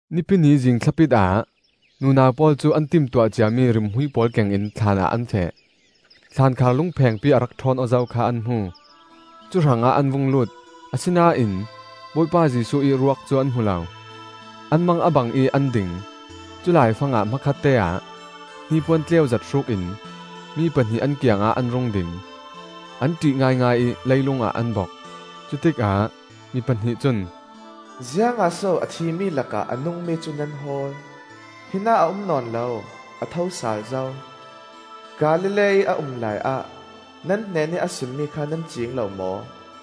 Nipi ni zing thlapit ah nunau pawl cu an timtuah ciami rimhmui pawl kengin thlaan ah an feh. Thlankhar lung phengpi a rak òhawn aw zo kha an hmu; cu hrangah an vung lut, asinain Bawipa Jesuh ih ruak cu an hmu lo. An mang a bang ih an ding; culai fangah hmakhatte ah hnipuan tleuzet hrukin mi pahnih an kiangah an rung ding. An òih ngaingai ih leilungah an bok; cutikah mi pahnih cun, öZiangah so a thimi lakah a nungmi cu nan hawl? Hinah a um nawn lo; a tho sal zo. Galilee-ih a um laiah nan hnenih a simmi kha nan ciing lo maw?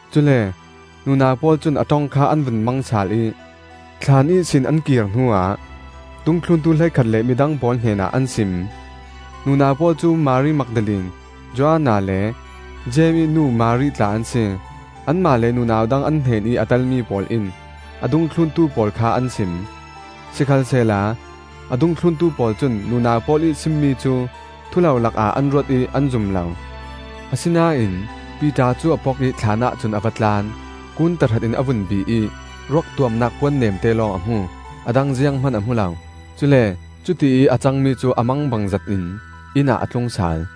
Cule nunau pawl cun a òong kha an vun mang sal ih, thlaan ihsin an kir hnuah dungthluntu hleikhat le midang pawl hnenah an sim. Nunau pawl cu Mari Magdalene, Joanna le Jeim ih nu Mari tla an si. Anmah le nunau dang an hnenih a telmi pawl in a dungthluntu pawl kha an sim. Sikhalsehla a dungthluntu pawl cun nunau pawl ih simmi cu thulolak ah an ruat ih an zum lo. Asinain Piter cu a pok ih thlaanah cun a va tlan. Kuun tahratin a vun bih ih ruak tuamnak puan neemte lawng a hmu; a dang zianghman a hmu lo. Cule cutiih a cangmi cu a mangbang zetin inn ah a tlung sal.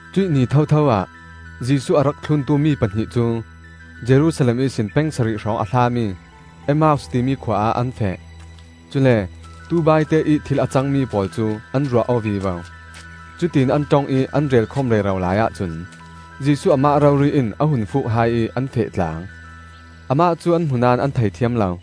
Cuih ni thotho ah Jesuh a rak thluntu mi pahnih cu Jerusalem ihsin peng sarih hrawng a hlami Emmaus timi khua ah an feh. Cule tubaite ih thil a cangmi pawl cu an ruah aw vivo. Cutiin an òong ih an relkhawm rero laiah cun Jesuh amah rori in a hun fuuk hai ih an feh tlang. Amah cu an hmu naón an thei thiam lo.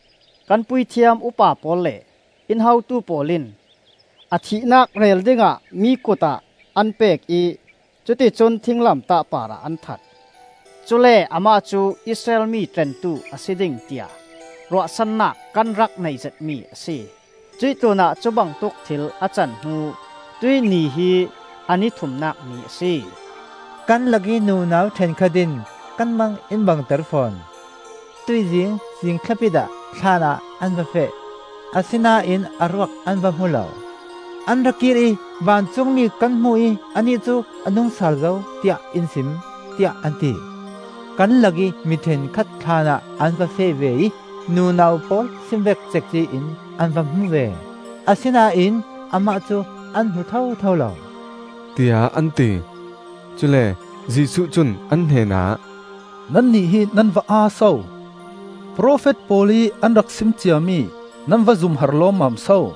Kan puithiam upa pawl le in hotu pawl in a thihnak rel dingah mi kut ah an pek ih cuticun thinglamtah parah an that. Cule amah cu Israel mi tlentu a si ding, tiah ruahsannak kan rak neih zetmi a si. Cuih tlunah cubangtuk thil a can hnu tuih ni hi a ni thumnak ni a si. Kan lakih nunau òhenkhat in kan mang in bangter fawn; tuihzing zingthlapit ah thlaan ah an va feh; asinain a ruak an va hmu lo. An ra kir ih ðVancungmi kan hmu ih Anih cu a nungsal zo, tiah in sim,ó tiah an ti. Kan lakih mi òhenkhat thlaanah an va feh ve ih nunau pawl sim vek cekci in an va hmu ve; asinain amah cu an hmu thotho lo,” tiah an ti. Cule Jesuh cun an hnenah, öNannih hi nan va aa so! Profet pawl ih an rak sim ciami nan va zum har lawmmam so!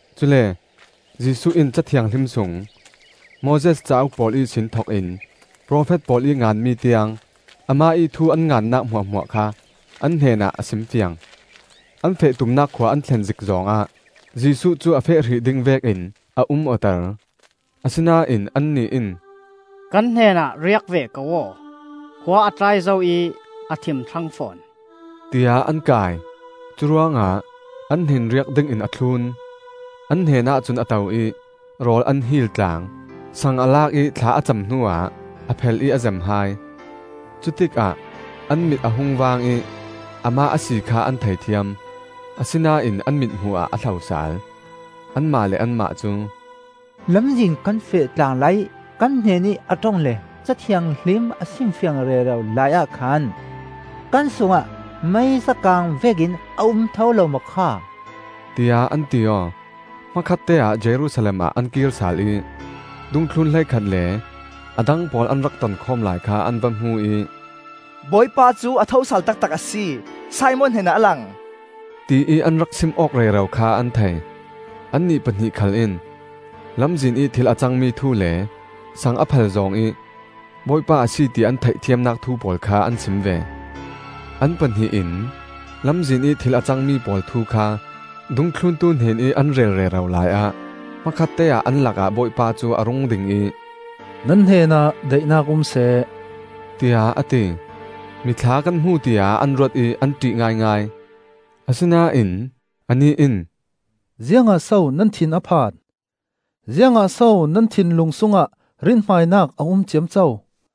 Cule Jesuh in Ca Thianghlim sung Moses cauk pawl ihsin thokin profet pawl ih nganmi tiang, amah ih thu an ngannak hmuahhmuah kha an hnenah a simfiang. An feh tumnak khua an thlen zik zawng ah Jesuh cu a feh hrih ding vekin a um awter. Asinain annih in, öKan hnenah riak ve ko aw! Khua a tlai zo ih a thim thlang fawn,” tiah an kai. Curuangah an hnen riak dingin a thlun. An hnenah cun a to ih rawl an hil tlang. Sang a lak ih thla a cam hnuah a phel ih a zem hai. Cutikah an mit a hung vaang ih Amah a si kha an thei thiam; asinain an mithmuh ah a hlo sal. Anmah le anmah cu, öLamzin kan feh tlang laiih kan hnenih a òong le Ca Thianghlim a simfiang rero laiah khan kan sungah meisa kang vekin a um tho lo maw kha?” tiah an ti aw. Hmakhatteah Jerusalem ah an kir sal ih dungthlun hleikhat le a dang pawl an rak tonkhawm lai kha an va hmu ih, öBawipa cu a tho sal taktak a si! Simon hnenah a lang!” tiih an rak sim awk rero kha an thei. Annih pahnih khal in lamzin ih thil a cangmi thu le sang a phel zawng ih Bawipa a si ti an theihthiamnak thu pawl kha an sim ve. An pahnih in lamzin ih thil a cangmi pawl thu kha dungthluntu hnenih an rel rero laiah hmakhatte ah an lakah Bawipa cu a rung ding ih, öNan hnenah daihnak um seh,” tiah a ti. Mithla kan hmu tiah an ruat ih an òih ngaingai. Asinain anih in, öZiangah so nan thin a phan? Ziangah so nan thinlung sungah rinhmainak a um ciamco?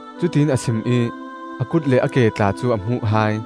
Cutiin a sim ih a kut le a ke tla cu a hmuh hai.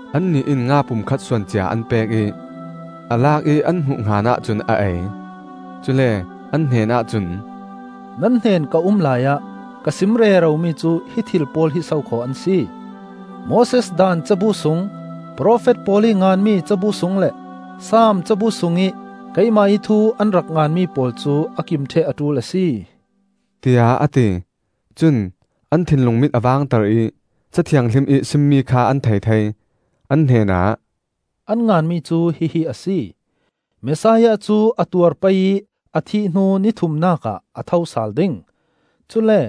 Annih in nga pum khat suan cia an pek ih, a lak ih an hmuh hnganah cun a ei. Cule an hnenah cun, öNan hnen ka um laiah ka sim reromi cu hi thil pawl hi sokhaw an si: Moses Daan cabu sung, profet pawl ih nganmi cabu sung le Saam cabu sungih keimah ih thu an rak nganmi pawl cu a kim òheh a òul a si,” tiah a ti. Cun an thinlung mit a vangter ih Ca Thianghlim ih simmi kha an thei thei. An hnenah, öAn nganmi cu hihi a si: Messiah cu a tuar pei ih a thih hnu ni thumnak ah a tho sal ding. Cule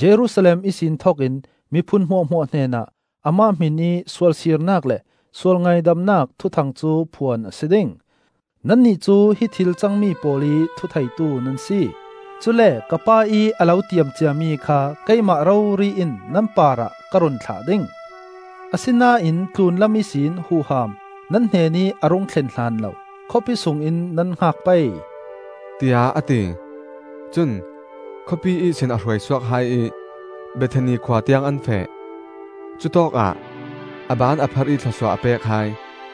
Jerusalem ihsin thokin miphun hmuahhmuah hnenah amah hmin ih sualsirnak le sualngaidamnak thuthang cu phuan a si ding. Nannih cu hi thil cangmi pawl ih thutheitu nan si. Cule ka Pa ih a lo tiam ciami kha keimah rori in nan parah ka run thlah ding. Asinain tlunlam ihsin huham nan hnenih a rung thlen hlanlo khawpi sungin nan hngak pei,” tiah a ti. Cun khawpi ihsin a hruai suak hai ih Bethani khua tiang an feh. Cutawkah a ban a pharh ih thlawsuah a pek hai.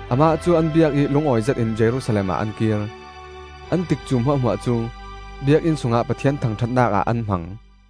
Amah cu an biak ih lungawi zetin Jerusalem ah an kir. An tikcu hmuahhmuah cu Biakinn sungah Pathian thangòhatnak ah an hmang.